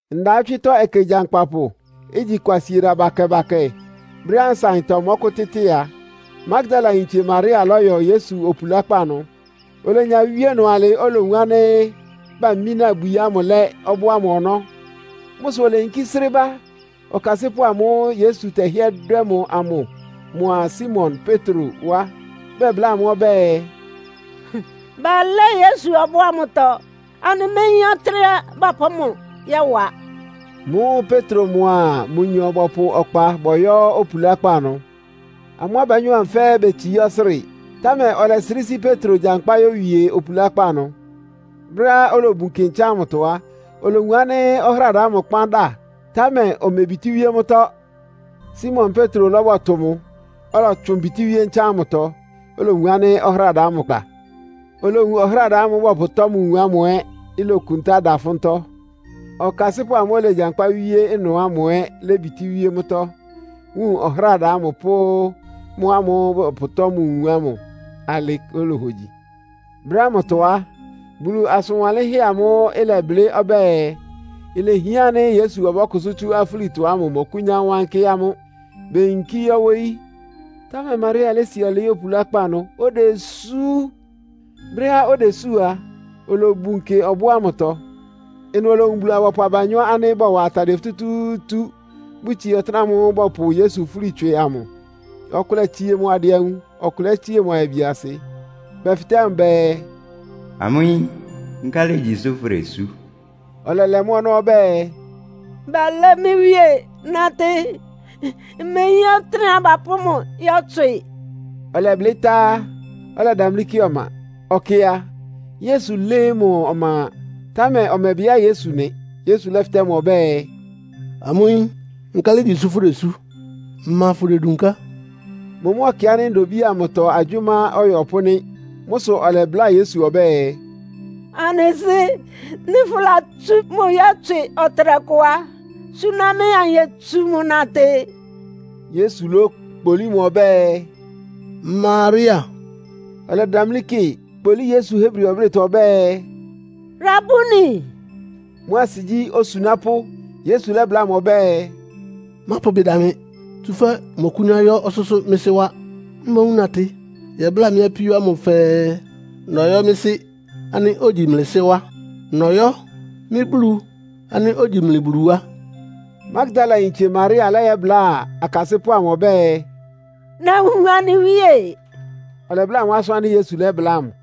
Ndawɔ́tswɩ́tɔ́ ɛkɛ gyankpapʋ, igyi Kwasieda bakɛ-bakɛ, brɛ́á nsaɩntɔ mɔ́kʋ́tɩ́tɩ a, Magdalayintse Maria lɔ́yɔ Yesu opulákpá ɩnʋ. Olenya wíe ɩnʋ alɩ́ olowun ánɩ́ bamína ibwi ámʋ lɛ́ ɔbɔ́ ámʋ ɔnɔ́. Mʋ́ sʋ oleyinkí srɩ́ ba ɔkasɩ́pʋ́ ámʋ́ʋ́ Yesu tɛhɩ́ɛ́ dwɛ́ mʋ amʋ mʋa Simon Petro wá, bɛbláa amʋ́ ɔbɛ́ɛ, “Balɛ́ Yesu ɔbɔ́ ámʋtɔ. Anɩméyín ɔtɩ́nɛ́á bapʋ́ mʋ yɔ́wa!” Mʋ́ʋ́ Petro mʋa mʋnyɔ bɔpʋ ɔkpa bɔyɔ́ opulákpá ɩnʋ. Amʋ́ abanyɔ́ ámʋ fɛ́ɛ́ betsií ɔsrɩ́ɩ, támɛ ɔlɛsrɩ́ sí Petro gyankpá yówie opulákpá ɩnʋ. Brɛ́á olobun kɩ ntsán ámʋtɔ á, olowun ánɩ́ ɔhráda ámʋ kpán dá, támɛ omebitíwíé mʋ́tɔ́. Simon Petro lɔ́bɔtʋ mʋ, ɔlɔtsʋn bítíwíé ntsán ámʋtɔ, olowun ɔhráda amʋ da. Olowun ɔhráda ámʋ́ʋ́ bɔpʋtɔ́ mʋ nwun ámʋ ɛ́, ilokuntá ɩda ɩfʋ́ntɔ́. Ɔkasɩ́pʋ́ amʋ́ʋ́ olegyankpá wíé ɩnʋ ámʋ ɛ́ lébitíwíé mʋ́tɔ́, wun ɔhráda ámʋ pʋ́ mʋ́ ámʋ́ʋ́ bɔpʋtɔ́ mʋ nwun ámʋ alɩ́ olohogyi. Brɛ́ ámʋtɔ á, Bulu asʋn wanlɩ́nhɛ́ amʋ́ʋ́ ɩlɛblɩ́ ɔbɛ́ɛ, ilehián ánɩ́ Yesu ɔbɔ́kʋsʋ́ tsú afúlitɔ ámʋ mɔkʋ́nyá wánkɩ́ amʋ́. Beyinkí yɔ́ wóyí. Támɛ Maria lési ɔlɩɩ́ opulákpá ɩnʋ odesú. Brɛ́á odesú a, olobun kɩ ɔbɔ́ ámʋtɔ. Ɩnʋ olowun Bulu-abɔpʋ abanyɔ́ ánɩ́ bɔwa atadɩɛ futútúútú, bʋtsie ɔtɩ́nɛ́ ámʋ́ʋ́ bɔpʋ Yesu fúli tswɩ amʋ. Ɔkʋlɛ tsie mʋ adɩanwun, ɔkʋlɛ tsie ayabiasɩ. Bɛfɩtɛ́ mʋ bɛɛ, “Amʋ́ yín, nkálɩ igyi sʋ́ fʋdesú?” Ɔlɛlɛ mʋ́ ɔnɔ́ ɔbɛ́ɛ, “Balɛ́ mɩ́ Wíe nátɩ́. Mmeyín ɔtɩ́nɛ́á bapʋ́ mʋ yɔ́tswɩ!” Ɔlɛblɩ́ tá á, ɔlɛdamlí kɩ ɔma. Ɔkɩ a, Yesu lɩ́ɩ́ mʋ ɔma, támɛ ɔmɛbɩá Yesu nɩ. Yesu lɛ́fɩtɛ́ mʋ ɔbɛ́ɛ, “Amʋ́ yín, nkálɩ ígyi sʋ́ fʋdesú? Ma fʋdedunká?” Mʋ mʋ́ ɔkɩ ánɩ́ ndobíi amʋtɔ agyʋ́má ɔyɔpʋ́ nɩ́. Mʋ́ sʋ ɔlɛbláa Yesu ɔbɛ́ɛ, “Anɩ sɩ́, nɩ́ fʋ́latsú mʋ yɔ́tswɩ ɔtɩnɛkʋ á, suna mɩ́, anyetsu mʋ natɩ.” Yesu lókpolí mʋ ɔbɛ́ɛ, “Maria.” Ɔlɛdamlí kɩ, kpólí Yesu Hebri ɔblɩ́tɔ ɔbɛ́ɛ, “Rabuni!” (Mʋ́ asɩ gyí, “Osunápʋ́.”) Yesu lɛ́bláa mʋ ɔbɛ́ɛ, “Mápʋ ɩbɩ da mɩ, tsúfɛ́ mmɔkʋ́nyá yɔ́ ɔsʋ́sʋ́ mɩ́ Sɩ́ wá. Mboún natɩ yɛbláa mɩ́ apíó ámʋ fɛɛ, nɔyɔ́ mɩ́ Sɩ́ ánɩ́ ogyi mlɩ Sɩ́ wá. Nɔyɔ́ mɩ́ Bulu ánɩ́ ogyi mlɩ Bulu wá.” Magdalayintse Maria lɛ́yɛbláa akasɩ́pʋ́ amʋ ɔbɛ́ɛ, “Nawun anɩ Wíe!” Ɔlɛbláa amʋ́ asʋ́n ánɩ́ Yesu lɛ́bláa mʋ.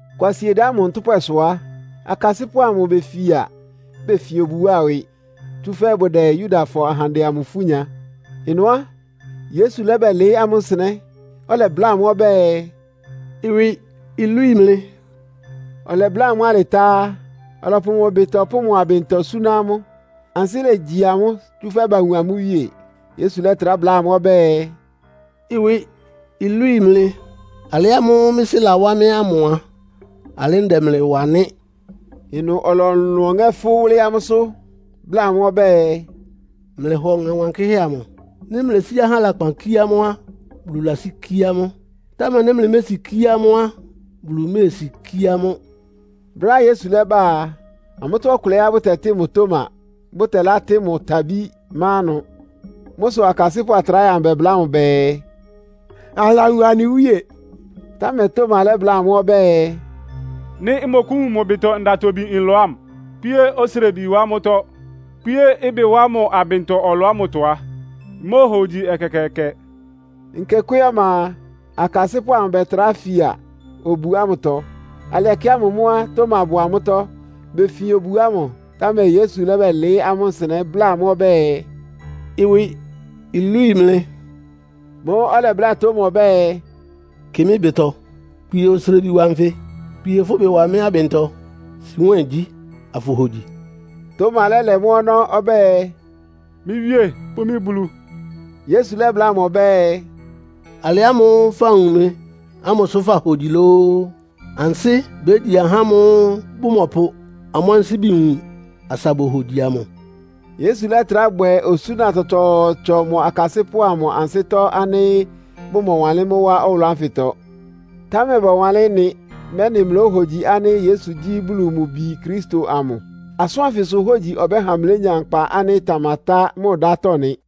Kwasieda ámʋ ntʋ́pwɛsʋ á, akasɩ́pʋ́ amʋ befia. Befin obu wá ɩwɩ, tsúfɛ́ bʋdɛ Yudafɔ ahandɛ amʋ ifú nya. Ɩnʋ á, Yesu lɛ́bɛlɩɩ́ amʋ́ nsɩnɛ́, ɔlɛbláa amʋ́ ɔbɛ́ɛ, “Ɩwɩ ilwíi mlɩ.” Ɔlɛbláa amʋ́ alɩ tá á, ɔlɔpʋ mʋ ɩbɩtɔ pʋ́ mʋ abɩntɔ súná amʋ́. Ansɩ́ légyi amʋ́, tsúfɛ́ bawun amʋ́ Wíe. Yesu lɛ́trá bláa amʋ́ ɔbɛ́ɛ, “Ɩwɩ ilwíi mlɩ. Alɩ ámʋ́ʋ́ mɩ́ Sɩ́ lawá mɩ́ ámʋ a, alɩ́ ndɛ mlɩ wa nɩ́.” Ɩnʋ ɔlɔlʋn ɔŋɛ́ fʋ́ wʋ́lɩ́ amʋ́sʋ́, bláa amʋ́ ɔbɛ́ɛ, “Mlɩhɔ Ɔŋɛ Wankɩ́hɛ́ amʋ. Nɩ́ mlesí ahá lakpan kíé amʋ́ á, Bulu lasíkíé amʋ́. Támɛ nɩ́ mlɩmésikíé amʋ́ á, Bulu méesikíé amʋ́.” Brɛ́á Yesu lɛ́ba a, amʋ́tɔ́ ɔkʋlɛá bʋtɛtɩ́ mʋ Toma, bʋtɛlátɩ́ mʋ Tabí má ɩnʋ. Mʋ́ sʋ akasɩ́pʋ́ atráhɛ amʋ bɛbláa mʋ bɛɛ, “Anɩlawun anɩ Wíe!” Támɛ Toma lɛ́bláa amʋ́ ɔbɛ́ɛ, “Nɩ́ mmɔkʋ́wun mʋ ɩbɩtɔ ndatobi nlɔ ámʋ, kpíé osrebi wá mʋ́tɔ́, kpíé ɩbɩ wá mʋ abɩntɔ ɔlɔ ámʋtɔ á, mmóohogyi ɛkɛkɛɛkɛ.” Nkekwé ɔma a, akasɩ́pʋ́ amʋ bɛtrá fia obu ámʋtɔ. Alɩ ɛkɛ ámʋ mʋ́ á, Toma bʋ́ amʋ́tɔ́. Befin obu ámʋ, támɛ Yesu lɛ́bɛlɩɩ́ amʋ́ nsɩnɛ́, bláa amʋ́ ɔbɛ́ɛ, “Ɩwɩ ilwíi mlɩ.” Mʋ́ʋ́ ɔlɛbláa Toma ɔbɛ́ɛ, “Kɩ mɩ́ ɩbɩtɔ, kpie osrebi wa nfɩ. Kpie fʋ́ ɩbɩ wa mɩ́ abɩntɔ. Si nwɛ́ɛn gyí, afʋhogyi!” Toma lɛ́lɛ mʋ́ ɔnɔ́ ɔbɛ́ɛ, “Mɩ́ Wíé pʋ́ mɩ́ Bulu!” Yesu lɛ́bláa mʋ ɔbɛ́ɛ, “Alɩ ámʋ́ʋ́ fawun mɩ ámʋ sʋ fahogyi lóó? Ansɩ́ bégyi ahá ámʋ́ʋ́ bʋmɔpʋ amʋ́ ansíbi wun, asa bohogyi amʋ!” Yesu lɛ́trá bwɛ osúna tsɔtsɔɔtsɔ mʋ akasɩ́pʋ́ amʋ ansɩ́tɔ́ ánɩ́ bʋmɔwanlɩ́n wá ɔwʋlʋ́ ánfɩtɔ. Támɛ bawánlɩ́n ɩ́nɩ, mɛ́nɩ mlóhogyi ánɩ́ Yesu gyí Bulu mʋ Bi Kristo amʋ. Asʋ́n ánfɩsʋ hógyi ɔbɛ́ha mlénya nkpa ánɩ́ ɩtamatá mʋ ɩdátɔ́ nɩ́.